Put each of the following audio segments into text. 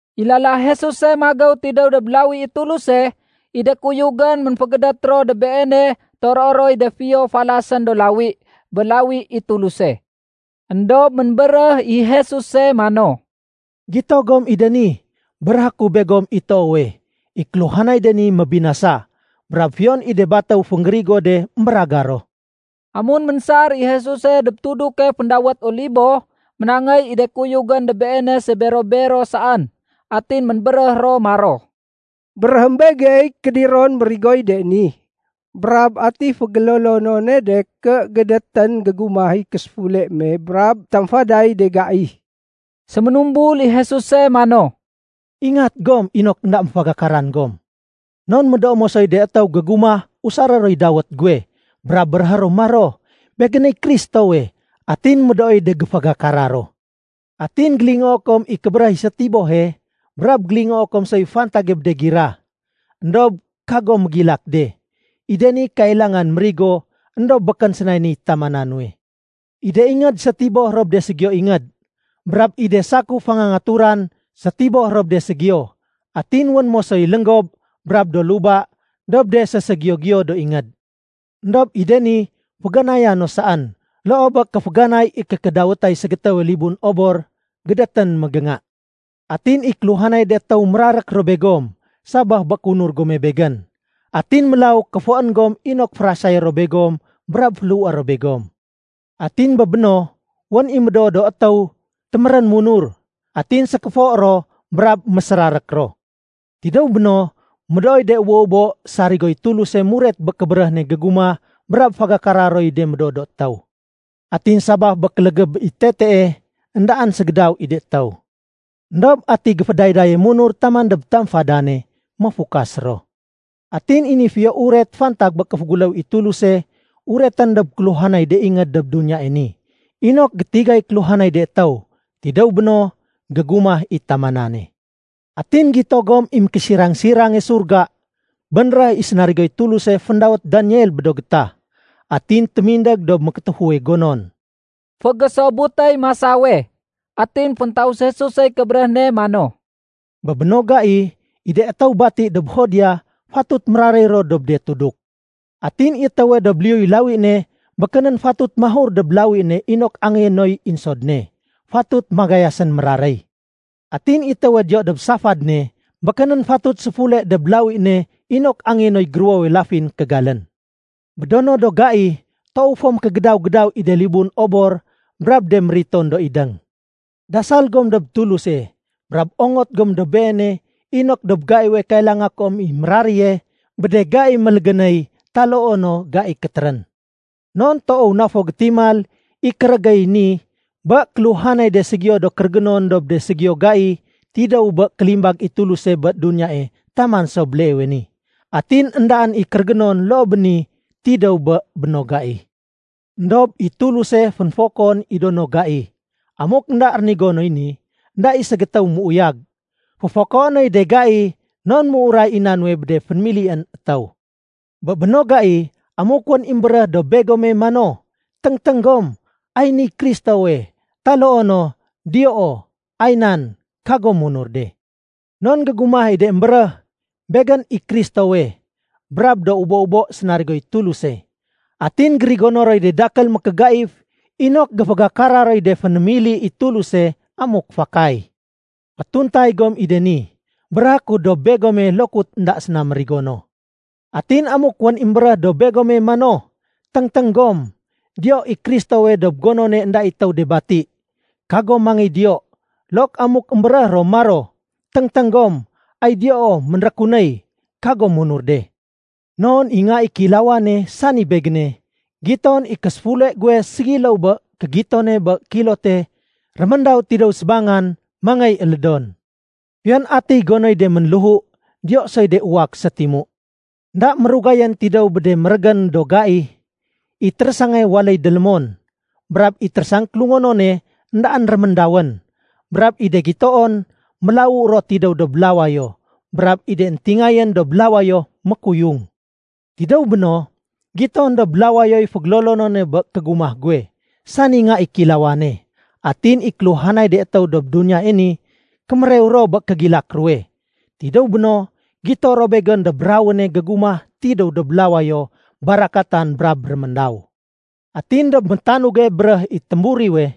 I lala Jesuse magéw tidéw dob lawi i Tuluse, i de kuyugén ménfégédét ro dob Beene toroé roy de fiyo falasén do lawi bé lawi i Tuluse. Endob ménbéréh i Jesuse mano, “Gito gom i de ni? Béréhé ku begom i toowe, i kéluhanay de ni mébinasa, brab fiyon i de batéw fénggérigo de émbéragar ro.” Amun ménsar i Jesuse dob tuduke féndawét Olibo, ménangéy i de kuyugén dob Beene sébero-bero saén. Atin ménbéréh ro maro, “Béréhém begey kédiron mérigoy de ni. Brab ati fégélolonone de ké gédétén gégumah i késéfule me brab tamfaday de gai?” Séménumbul i Jesuse mano, “Ingat gom inok énda méfagakaran gom. Non médoo mosoy de étéw gégumah usaré roy dawét guwe, brab béréhé ro maro, ‘Begéney Kristowe.’ Atin médooy de géfagakara ro. Atin gélingoo kom i kébéréh i sétibohe brab gélingoo kom soy fantage bé de gira. Endob kagom mégilak de. I de ni kailangan mérigo éndob békén sénay ni tamana nuwe. I de ingéd sétiboh ro bé de ségiyo ingéd. Brab i de sakuf fangangaturan sétiboh ro bé de ségiyo. Atin wén mosoy lénggob brab do luba dob de séségiyo-giyo do ingéd. Endob i de ni féganaya no saén loo bé kéféganay i kékédawétay ségétéwe libun obor gédétén mégénga. “Atin i kéluhanay de étéw mérarék ro begom sabaf bé kéunur gome Begén. Atin mélaw kéfoén gom inok férasayé ro begom brab féléhué ro begom. Atin bé béno, wén i médoo do étéw témérén munur. Atin sékéfo ro brab mésérarék ro. Tidéw béno, médooy de ubo-ubo sarigoy Tuluse muret bé kébéréh ne gégumah brab fégakara roy de médoo do étéw. Atin sabaf bé kélégéb i tetee, éndaén ségédaw i de étéw. Endob ati géfédaydaye munur taman dob tamfadane, méfukas ro. Atin i ni Fiyo Uret fantag bé kéféguléw i Tuluse uretén dob kéluhanay de ingéd dob duniyae ni inok gétigay kéluhanay de étéw. Tidéw béno, gégumah i tamanane. “Atin gito gom i ‘Mékésirang-sirange Surga’ bénréh i sénarigoy Tuluse féndawét Daniel bé do gétah. Atin témindég dob mékétéfuwe gonon.” (Fégésobutéy masawe.) Atin féntaus Jesusey kébéréh ne mano, “Bé béno gai, i de étéw bati dob Judea fatut méraréy ro dob de tuduk. Atin i étéwe dob liyuy lawi ne, békénén fatut mahur dob lawi ne inok angéyé noy insod ne. Fatut magayasén méraréy. Atin i étéwe diyo dob safad ne, békénén fatut séfule dob lawi ne inok angéyé noy géruwowe lafin kégalén. Bé do no do gai, toow fo mékégédaw-gédaw i de libun obor brab de mériton do idéng. Dasal gom dob Tuluse brab ongot gom dob Beene inok dob gaiwe kailanga kom i méraréye bé de gai mélégénéy taloo no gai kétérén. Non toow na fo gétimal i kérégéy ni bé kéluhanay de ségiyo do kérégénon dob ségiyowe gai tidéw bé kélimbag i Tuluse bé duniyae taman so béleewe ni. Atin éndaén i kérégénon loo bé ni tidéw bé béno gai. Endob i Tuluse fénfokoén i do no gai. Amuk énda rénigo noy ni, énda i ségétéw méuyag. Féfokoé noy de gai non ménuray i na nuwe bé de fénémilién étéw. “Bé béno gai, amuk wén i émbéréh dob begome mano, ‘Téngténg gom, ay niy Kristowe,’ taloo no ‘Diyoo, ay nan,’ kagom munur de. Non gégumah i de émbéréh, ‘Begén i Kristowe,’ brab do ubo-ubo sénarigoy Tuluse. Atin gérigono roy de dakél mékégaif inok géfagakara roy de fénémili i Tuluse, amuk fakay. Fétuntay gom i de ni. Béréhé ku dob begome lokut énda séna mérigo no. “Atin amuk wén i émbéréh dob begome mano, ‘Téngténg gom, diyo i Kristowe dob gonone énda i étéw de bati,’ kagom mangéy diyo. Look amuk émbéréh ro maro, ‘Téngténg gom, ay diyoo ménrékunéy,’ kagom munur de. Non i Nga i Kéilawane, sani Begéne, giton i késéfule guwe ségiléw bé kégitone bé kilote réméndaw tidéw sébangan mangéy élédon. “Fiyon atiy gonoy de ménléhu, diyo soy de uwak sétimu. “Enda mérugayén tidéw bé de mérégén do gai, i térésange waléy délémon, brab i térésang kélungonone éndaén réméndawén, brab i de gitoon mélawu ro tidéw dob lawayo brab i de éntingayén dob lawayo mékuyung. Tidéw béno, giton dob lawayoy fégélolonone bé kégumah guwe, sani Nga i Kéilawane. Atin i kéluhanay de étéw dob duniyae ni kémérew ro bé kégilak ruwe. Tidéw béno, gito ro Begén dob rawéne gégumah tidéw dob lawayo barakatan brab réméndaw. Atin dob métanuge béréh i témburiwe,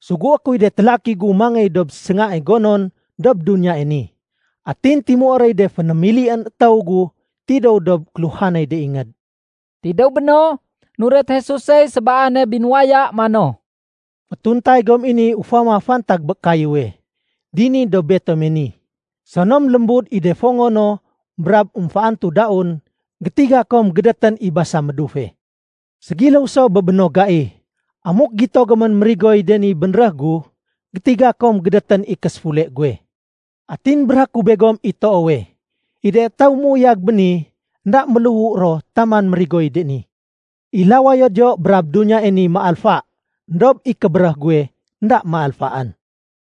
sugué kuy de télaki gu mangéy dob séngae gonon dob duniyae ni. Atin timué roy de fénémilién étéw gu tidéw dob kéluhanay de ingéd.” Tidéw béno, nuret Jesusey sébaane binuwaya mano, “Fétuntay gom i ni ufama fantag bé kayéwe. Dini dob betome ni, sonom lémbud i de fongo no brab émféantu daun, gétiga kom gédétén i basa médufe. Ségiléw so bé béno gai. Amuk gito gomén mérigoy de ni bénréh gu, gétiga kom gédétén i késéfule guwe. Atin béréhé ku begom i toowe, i de étéw méuyag béni, énda méléhu ro taman mérigoy de ni. I lawayo diyo brab duniyae ni méalfa, éndob i kébéréh guwe énda méalfaén.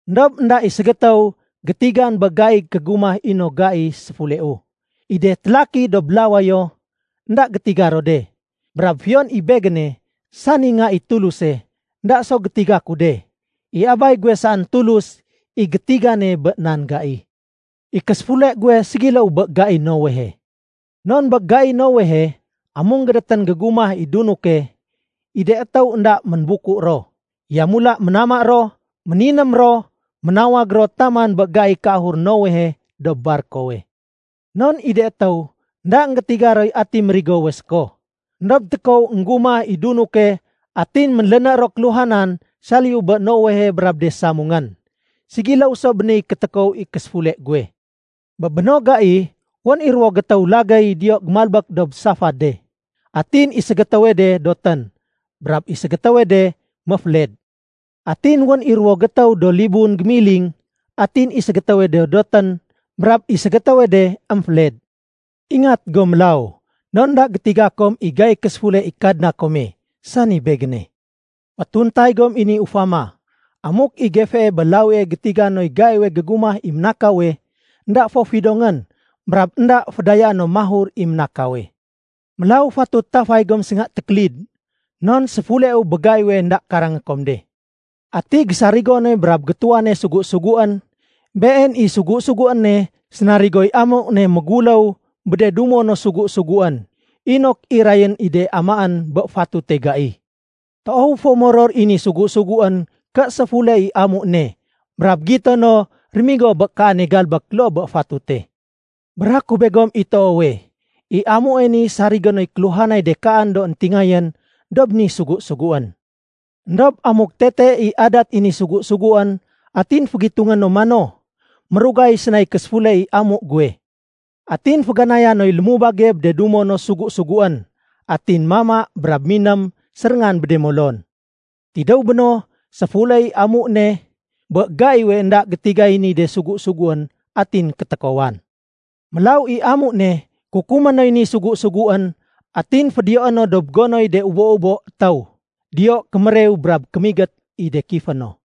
“Endob énda i ségétéw gétigan bé gaiy kégumah i no gai séfuleu. I de télaki dob lawayo énda gétiga ro de, brab fiyon i Begéne, sani Nga i Tuluse, énda so gétiga ku de. I Abay guwe saén Tulus i gétigane bé nan gai. I késéfule guwe ségiléw bé gai Noehe. Non bé gai Noehe, amun gédétén gégumah i dunuke, i de étéw énda ménbuku ro. Yamula ménama ro, méniném ro, ménawag ro taman bé gaiy kéahur Noehe dob barkowe. Non i de étéw énda énggétiga roy ati mérigowe séko. Endob tékow énggumah i dunuke atin ménléné ro kéluhanan saliyu bé Noehe brab de samungén. Ségiléw so bé niy kétékow i késéfule guwe. Bé béno gai, wén i ruwo gétéw lagéy diyo gémalbék dob safade, atin i ségétéwe de dotén brab i ségétéwe de méféled. Atin wén i ruwo gétéw do libun gémiling, atin i ségétéwe de dotén, brab i ségétéwe de émféled. Ingat gom mélaw, non énda gétiga kom i gaiy késéfule i Kadna kome, sani Begéne. Fétuntay gom i ni ufama. Amuk i gefee bé lawie gétiga noy gaiwe gégumah i ménakawe, énda fo fidongén brab énda fédayaé no mahur i ménakawe. Mélaw fatut tafay gom sénga tékélid. Non séfuleu bé gaiwe énda karangé kom de. “Ati gésarigone brab gétuwane sugu-suguén? Been i sugu-suguéne sénarigoy amu ne méguléw bé de dumo no sugu-suguén, inok irayén i de amaén bé fatute gai. Toow fo moror i ni sugu-suguén ké séfule i amu ne brab gito no rémigo bé kaane galbék loo bé fatute. Béréhé ku begom i toowe, i amue ni sarigé noy kéluhanay de kaan do éntingayén dob ni sugu-suguén. Endob amuk tete i adat i ni sugu-suguén atin fégitungé no mano, ‘Mérugay sénay késéfule i amu guwe.’ Atin féganaya noy lémubage bé de dumo no sugu-suguén, atin mama brab miném séréngan bé de molon. Tidéw béno, séfule i amu ne bé gaiwe énda gétigay ni de sugu-suguén, atin kétékowan. Mélaw i amu ne, kukumé noy ni sugu-suguén atin fédiyoé no dob gonoy de ubo-ubo étéw. Diyo kémérew brab kémigét i de kifé no.”